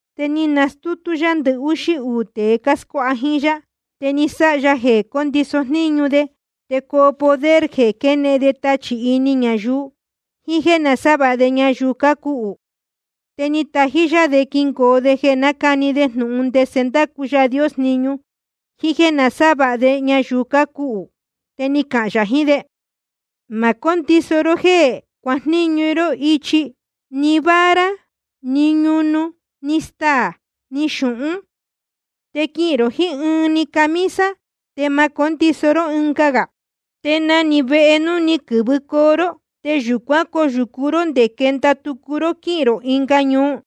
Te ni nastútú yá ndɨhúxí uū tēe cáscuáha jíín yá, te ni sáha ya jeē cóndiso jníñu de te coo poder de jeē quénehen de tachī ini ñayuu, jiín jéē nasávāha de ñayuu cácuhū. Te ni tají yá de quingoo de jeē nácani de jnūhun ndese ndácu Yaā Dios jniñu, jiín jéē nasávāha de ñayuu cácuhū. Te ni cahān yā jiín de: Ma cóndiso ró jéē cuajníñu ró ichi, ni vara, ni ñunu, ni staā, ni xūhún. Te quihīn rō jiín ɨɨn‑ni camisa, te ma cóndiso ró ɨnga. Te na‑ni vehe núu ni quɨ̄vɨcoo ró, te yūcuán coyūcu ró nde quenda tucu ró quíhīn rō ɨnga ñuu.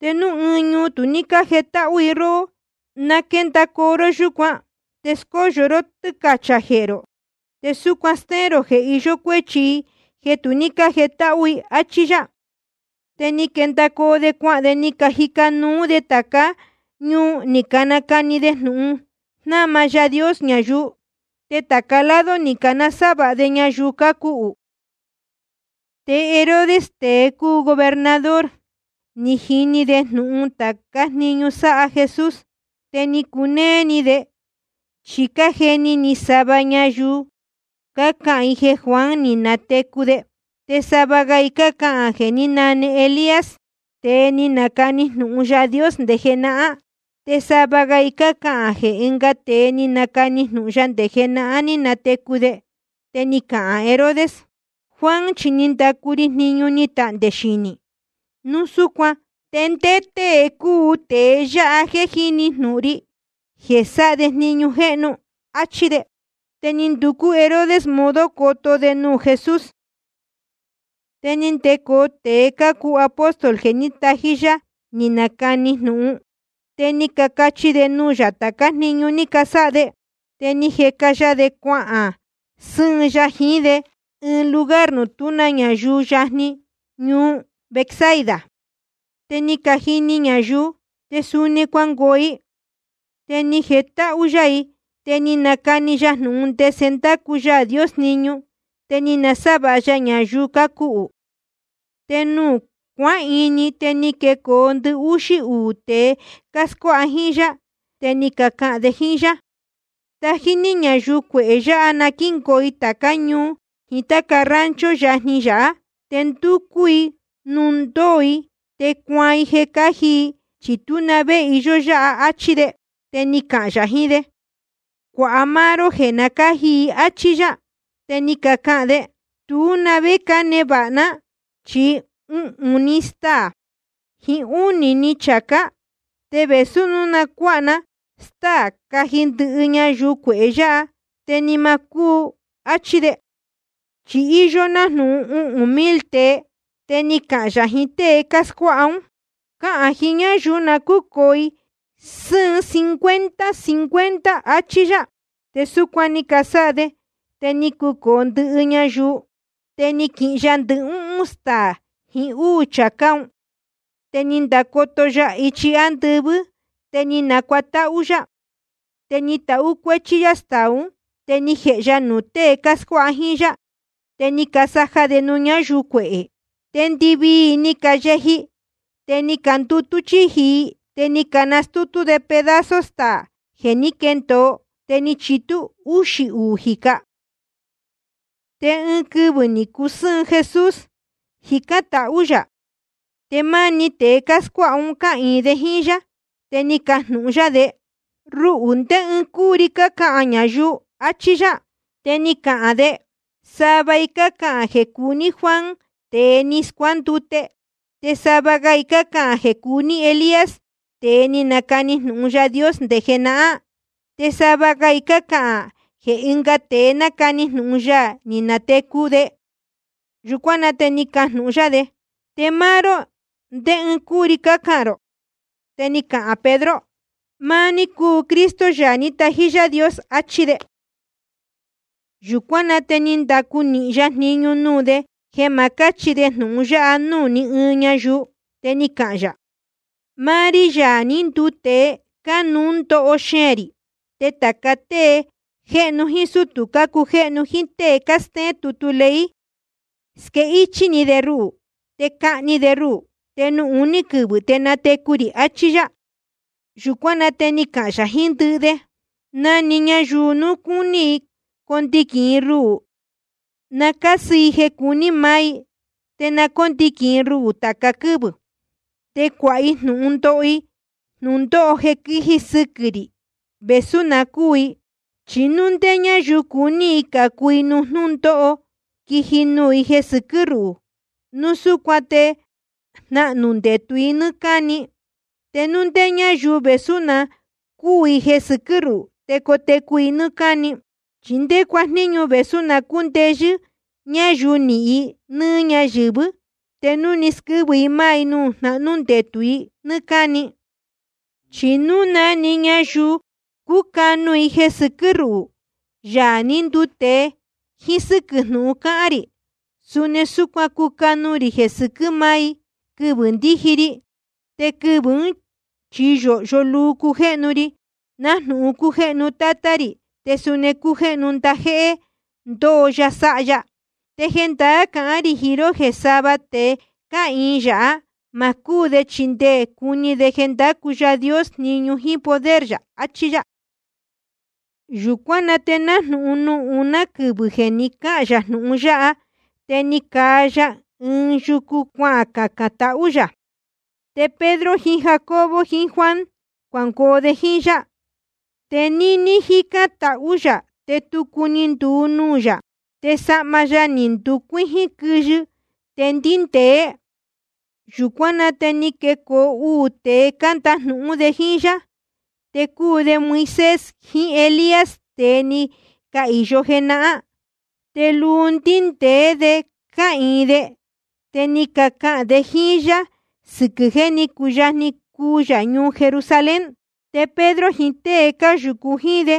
Te núu ɨɨn ñuu tu cájetáhú i róhó, na quéndacoo ró yúcuan, te scóyo ró tɨ́cachā jehē rō, te súcuan stéén rō jeē iyó cuéchi i jeē tu ní cájetáhú i. Achí yá. Te ni quendacoo de cuahān de, ni cajica nuu de tācá ñuu, ni canacani de jnūhun jnáma Yaā Dios ñayuu. Te tāca lado ni canasávāha de ñayuu cácuhū. Te Herodes, tēe cúu gobernador, ni jini jnūhun de tācá jniñu sáha Jesús. Te ni cunéé ni de, chi cájeni ni sava ñayuu cácahān i jeē Juan ni natecu de. Te sava ga i cácahān jeē ní nane Elías, tēe ni nacani jnūhun Yaā Dios nde jenahán. Te sava ga i cácahān jeē ɨnga tēe ni nacani jnūhun ya nde jenahán, ní natecu de. Te ni cahān Herodes: Juan chi ni ndacu ri jniñu ni tahndē xinī. Núu súcuan ¿te ndé tée cúu tēe yáha jeē jíni jnūhun ri jeē sáha de jniñu jéhnu? Achí de. Te ni nducú Herodes modo coto de nuū Jesús. Te ni ndecoo tēe cácuu apóstol jeē ní tají yá ni canacani jnūhun. Te ni cacachi de nuū yā tācá jniñu ni casáha de. Te ni jeca ya de cuahān sɨ́ɨn ya jiín de ɨɨn lugar nuū tú ñayuu, yajni ñuu Betsaida. Te ni cajini ñayuu, te suni cuangoo i. Te ni jetáhú yá i, te ni nacani ya jnūhun ndese ndácu Yaā Dios jniñu, te ni nasávāha ya ñayuu cácuhū. Te nuū cuáhini, te ni quecoo ndɨhúxí uū tēe cáscuáha jíín yá, te ni cacahān de jíín yá: Tají ní ñayuu cuehē yāhá na quíngoo i tācá ñuu jiín táca rancho yajni yāhá, te nducú i nuū ndóo i te cuaan i jeē cáji i, chi tú na vé iyó yáha, áchí de. Te ni cahān yā jiín de: Cuāha máá ró jeē cáji i, áchí yá. Te ni cacahān de: Tú na vé cánevāha ná, chi uhūn‑ni staā jiín úū‑ni chācá. Te vēsú núu quicuaan ná stáā caji ndɨhɨ ñayuu cuehē yáha, te ni ma cúu, áchí de. Chi íyó nájnūhun uhūn mil tēe. Te ni cahān yā jiín tée cáscuáha ún: Cahān jiín ñáyuu na cúcōo sɨ́ɨn cincuenta cincuenta i, áchí yá. Te súcuan ni casáha de, te ni cacucōo ndɨhɨ ñayuu. Te ni quihin ya ndɨhúhún staā jiín úū chācá un, te ni ndacoto ya ichi ándɨvɨ́, te ni nacuatáhú yá. Te ni tahú cuéchí yá staā ún, te ni jēhe ya nuū tée cáscuáha jíín yá, te ni casaja de nuū ñáyuu cuehē. Te ndɨvii i ni cayeji, te ni candutú chíji i. Te ni canastútú de pedazo staā jeē ní quendōo, te ni chitú úxī uū jīca. Te ɨɨn quɨvɨ̄ ni cusɨ́ɨn Jesús, jícán tahú yā, te máá‑ni tēe cáscuáha un cáhīin de jíín yá. Te ni cajnūhun yá de: Ruhū, ¿ndé ɨɨn cúu ri cácahān ñayuu? achí yá. Te ni cacahān de: Sava i cácahān jeē cúu ní Juan tēe ni scuándute. Te sava ga i cácahān jeē cúu ní Elías, tēe ni nacani jnūhun Yaā Dios nde jenahán. Te sava ga i cácahān jeē ɨnga tēe ni nacani jnūhun ya ni natecu de. Yūcuán na te ni cajnūhun yá de: Te máá ró, ¿ndé ɨɨn cúu ri cácahān rō? Te ni cahān Pedro: Máá ní cúu Cristo, Yaā ní tají Yaā Dios, achí de. Yūcuán na te ni ndacu nīhin ya jniñu nuū de jeē ma cáchi de jnūhun yáha núū ní ɨɨn ñayuu. Te ni cahān yā: Máá rí, Yaā ní nduu tēe, cánuú ndoho xeēn rī. Te tāca tée jéhnu jíín sútū cácujéhnu jíín tée cástéén tutu ley, squéhichī de ruhū. Te cahni de ruhū, te nuū uní quɨvɨ̄ te natecu rī, achí yá. Yūcuán na te ni cahān yā jiín ndɨhɨ de: Na‑ni ñayuu núu cúní i condiquīn i ruhū, na cásɨ i jeē cuní maá i, te na cóndiquīn i ruhū tāca quɨ́vɨ̄, te cuāha i jnūhun ndoho i jnūndóho jeē sɨquɨ́ rī, vēsú na cúū i. Chi núu ndé ñáyuu cuní i cācu i nuū jnúndóho quiji nuū i jeē sɨquɨ́ ruhū, núu súcuan te jnahnū ndetū i nɨ́ɨ́ cáni. Te núu ndé ñáyuu, vēsú na cúū i jeē sɨquɨ́ ruhū, te cotecu i nɨ́ɨ́ cáni. ¿Chi ndé cuajníñu vēsú na cúndeyɨ́ ñayuu nihīn i nɨ́ɨ́ ñáyɨ̄vɨ́, te núu squɨ́vɨ i máá i nuū jnahnú ndetū i nɨ́ɨ́ cáni? Chi núu na‑ni ñayuu cúcanu i jeē sɨquɨ́ ruhū, Yaā ní nduu tēe, jíín sɨ́quɨ̄ jnúhun cáhán rī, suni súcuan cucanu rī jeē sɨquɨ́ máá i, quɨvɨ̄ ndíji ri. Te quɨvɨ̄ ún chi yōhyo luu cujéhnu ri, nájnūhun cújéhnu Tátá rī, te suni cácujéhnu ndajéhé ndoo ya sáha ya. Te jendaá cahán rī jiín ró jeē sava tēe cáhīin yāhá, ma cúū de chi nde cuni de jeē ndácu Yaā Dios jniñu jíín poder yā. Achí yá. Yūcuán na te nájnūhun nuū uná quɨvɨ̄ jeē ni cáhān yā jnūhun yáha, te ni caa ya ɨɨn yucu, cuacacān tahú yā. Te Pedro jiín Jacobo jiín Juan cuangoo de jíín yá. Te níní jícán tahú yā, te tucu ni nduu nuū yā, te sahma ya ni nducuíjín quɨyɨ, te ndíndēé. Yūcuán na te ni canecoo uū tēe, cándajnūhún de jíín yá. Te cúu de Moisés jiín Elías, tēe ni cahīyo jenahán. Te luu ndíndēé de cáhīin de, te ni cacahān de jíín yá sɨquɨ̄ jeē ní cuyajni cuu yā ñuu Jerusalén. Te Pedro jiín tée cáyūcu jíín de,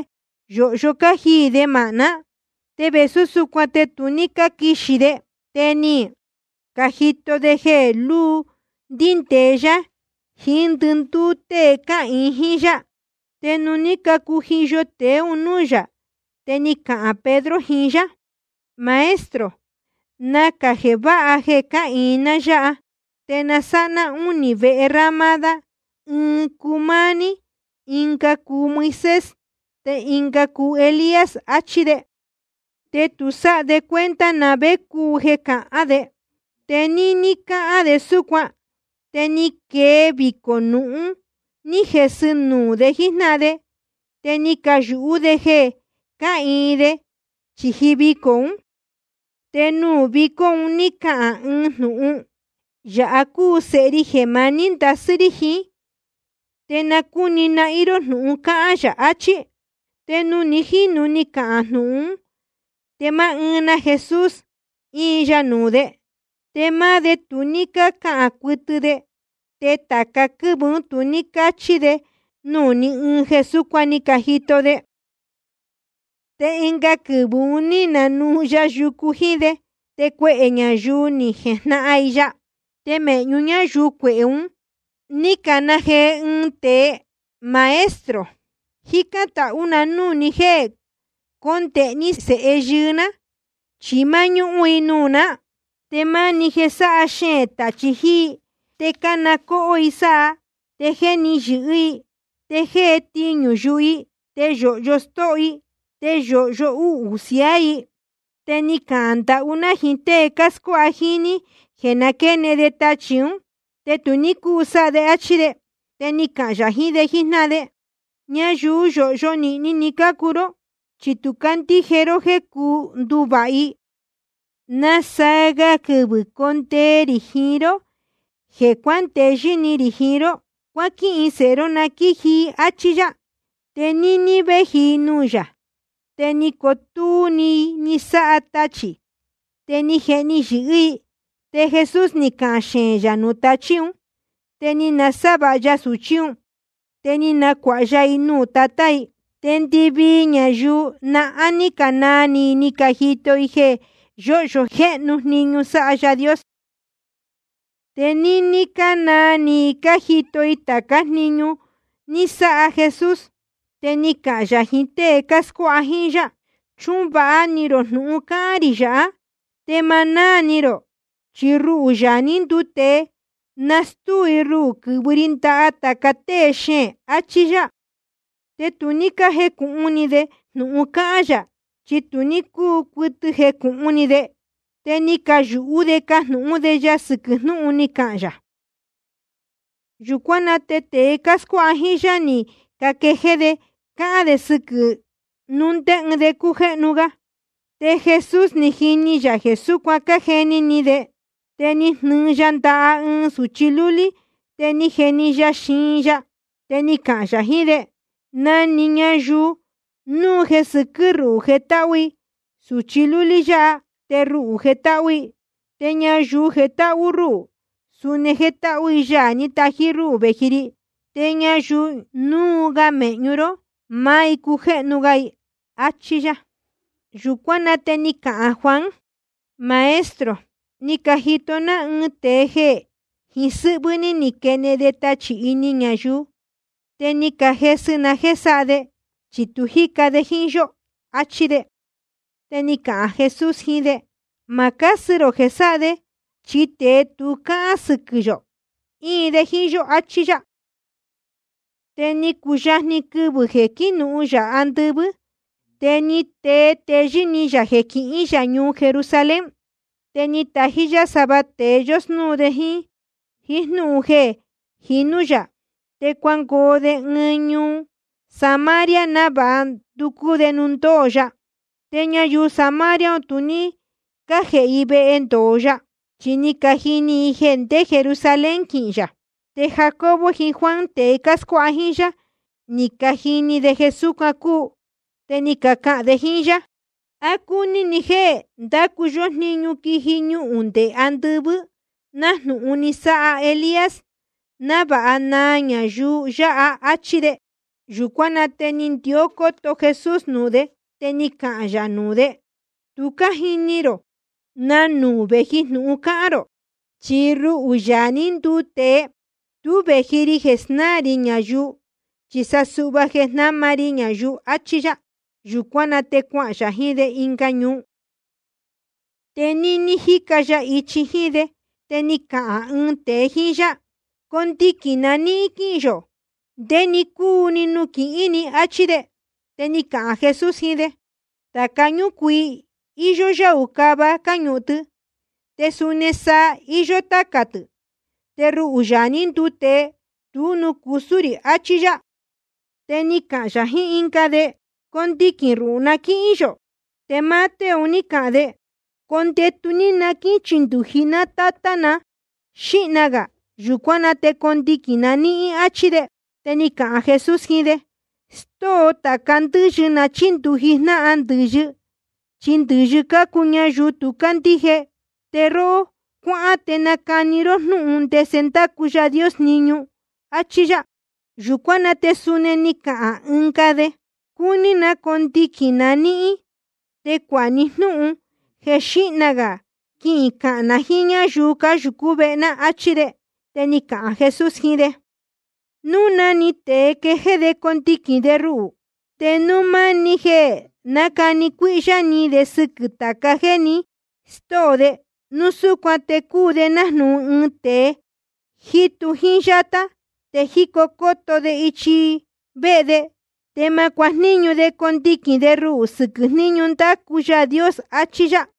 yōhyo cájiī de māhná, te vēsú súcuan te tu ní cáquixī de. Te ni cajito de jeē lúu ndíndēe yá jiín ndɨndúú tée cáhīin jíín yá. Te nuū ní cacujiyo tēe un núū yā, te ni cahān Pedro jiín yá: Maestro, nacā jeē váha jeē cáhīin ná yáha. Te na sáha ná únī vehe ramada, ɨɨn cuu máá ní, ɨnga cuu Moisés, te ɨnga cuu Elías, achí de. Te tu sáha de cuenta na vé cúu jeē cahán de. Te níní cáhán de súcuan, te ni quee vicō nūhun ní jesɨ nuū de jíjnáhan de. Te ni cayūhú de jeē cáhīin de chīji vicō ún. Te nuū vicó un ní cahān ɨɨn jnūhun: Yāha cúu Sēhe ri jeē maní ndasɨ́ rí jiín. Te na cúni nahín ró jnūhun cáhán yā, achí. Te nuū ni jínu ni cahān jnūhun ún, te máá ɨɨn na Jesús íin ya nuū de. Te máá de tu ní cácahān cuɨtɨ de, te tāca quɨ́vɨ̄ ún tu ní cácachi de nuū ni ɨɨn jeē súcuan ni cajito de. Te ɨnga quɨvɨ̄ un ní nanuu ya yucu jíín de. Te cuehē ñayuu ni jejnahan i ya. Te mēhñu ñáyuu cuehē un ní cana jee ɨɨn tēe: Maestro, jícán tahú na núū ni jéē condēhe ní sēhe yɨɨ́ ná, chi máñúhún i nuū ná. Te máni jeē sáha xeēn tachī jiín i, te cána cóhó i sáha, te jéhni yɨ̄hɨ́ i, te jée tiñū yuhu i. Te yōhyo stóho i, te yōhyo uhū siaá i. Te ni cahān ndahú ná jiín tée cáscuáha jíín ní jeē na quénehen te tachī ún, te tu ní cúu sáha de, áchí de. Te ni cahān yā jiín de jíjnáhan de: Ñayuu yōhyo nīhni ni cácuu ró, chi tu cácandíje ró jéē cuu nduvāha i. ¿Nasaa ga quɨvɨ̄ condee rī jiín ró jeē cuándeyɨ́ ni rī jiín ró? Cuáquihin sēhe ró na quíji i, áchí yá. Te níní véji i nuū yā, te ni cotúú i ni sáha tachī, te ni jehni yɨ̄hɨ́ i. Te Jesús ni cahān xeēn yā nuū tachí un, te ni nasávāha ya sūchí un, te ni nacuāha ya i nuū tatá i. Te ndɨvii ñayuu nahán ní canaa ni i cájito i jeē yóhyo jéhnu jniñu sáha Yaā Dios. Te níní cánaa ni i cájito i tācá jniñu ni sáha Jesús, te ni cahān yā jiín tée cáscuáha jíín yá: Chuhun vāha ni rō jnūhun cáhán rī yāhá, te ma náā ni rō, chi ruhū, Yaā ní nduu tēe, nastúu i ruhū quɨ̄vɨ ri ndaha tāca tée xeēn, achí yá. Te tu ní cájecūhun ni de jnūhun cáhán yā, chi tu ní cúu cuɨtɨ jecūhun ni de. Te ni cayūhú de cajnūhún de ya sɨquɨ̄ jnúhun ni cahān yā. Yūcuán na te tēe cáscuáha jíín yá ni caquejéé de cácahān de sɨquɨ̄ núu ndé ɨɨn de cújéhnu ga. Te Jesús ni jini yā jeē súcuan cájeni ni de. Te ni jnɨɨ ya ndaha ɨɨn sūchi lúlí, te ni jeni ya i xiin ya. Te ni cahān yā jiín de: Na‑ni ñayuu núu jeē sɨquɨ́ ruhū jetáhú i sūchi lúlí yáha, te ruhū jetáhú i. Te ñayuu jetáhú rúhū, suni jétáhú i Yaā ní tají rúhū vēji ri. Te ñayuu núu ga mēhñu ró, máá i cújéhnu ga, achí yá. Yūcuán na te ni cahān Juan: Maestro, ni cajito ná ɨɨn tēe jeē jiín sɨ́hvɨ́ ní quénehen de tachī ini ñayuu. Te ni cajesɨ na jéē sáha de, chi tu jíca de jíín yó, achí de. Te ni cahān Jesús jiín de: Ma cásɨ rō jeē sáha de, chi tēe tu cáhán sɨquɨ̄ yō, íin de jíín yó, achí yá. Te ni cuyajni quɨvɨ̄ jeē quínuhun yā andɨvɨ́, te ni tee téyɨ́ ni yā jeē quihín yā ñuu Jerusalén. Te ni tají yá sava tēe yósnúu de jíín jnúhun jeē jinú yā. Te cuangoo de ɨɨn ñuu Samaria návāha nducú de nuū ndóo ya. Te ñayuu Samaria un tu ní cájēhe i vehe ndōo ya, chi ni cajini i jeē ndé Jerusalén quihīn yā. Te Jacobo jiín Juan, tēe cáscuáha jíín yá, ni cajini de jeē súcuan cúu, te ni cacahān de jíín yá: ¿A cúní ni jéē ndácu yó jniñu quiji ñuhūn nde andɨvɨ́, nájnūhun ni sáha Elías, návāha naa ñayuu yáha? Achí de. Yūcuán na te ni ndió cóto Jesús nuū de, te ni cahān yā nuū de: Tu cájini rō na nuū vēji jnūhun cácahān rō. Chi ruhū, Yaā ní nduu tēe, tú vēji ri jeē snáā rī ñayuu, chi sa suhva jeē jnáma ri ñayuu, achí yá. Yūcuán na te cuahān yā jiín de ɨnga ñuu. Te níní jíca ya ichi jíín de, te ni cahān ɨɨn tēe jíín yá: Condiquīn na níhín quíhīn yō ndé‑ni cúu‑ni nuū quihín ni, áchí de. Te ni cahān Jesús jiín de: Tāca ñúcuii, íyó yáū cava cáñuhun tɨ. Te suni saa, iyó tácā tɨ̄. Te ruhū, Yaā ní nduu tēe, tú nuū cusú rī, achí yá. Te ni cahān yā jiín ɨnga de: Condiquīn ruhū na quíhín yō. Te máá tée un ní cahān de: Condetu ní ndé na quíchindūji ná tátá na xíhna gā. Yūcuán na te condiquīn na níhín, áchí de. Te ni cahān Jesús jiín de: Stóo tāca ndɨ́yɨ na chíndūji jnáhan ndɨ̄yɨ, chi ndɨ̄yɨ cácuu ñayuu tu cácandíje. Te róhó, cuáhán te nacani ró jnúhun ndese ndácu Yaā Dios jniñu, áchí yá. Yūcuán na te suni ni cahān ɨnga de: Cúní na condiquīn na níhín, te cuāha ní jnúhun jeē xíhna gā quicahān na jíín ñáyuu cáyūcú vehe ná, áchí de. Te ni cahān Jesús jiín de: Núu na‑ni tēe quéjéé de condiquīn de ruhū, te núu máni jeē nácani cuíhyá ni de sɨquɨ̄ tāca jéē ni stóo de, núu súcuan te cúu de nájnūhun ɨɨn tēe jítu jíín yátá, te jícó cóto de ichi vehe de. Te ma cuajníñu de condiquīn de ruhū sɨquɨ̄ jníñu ndácu Yaā Dios, achí yá.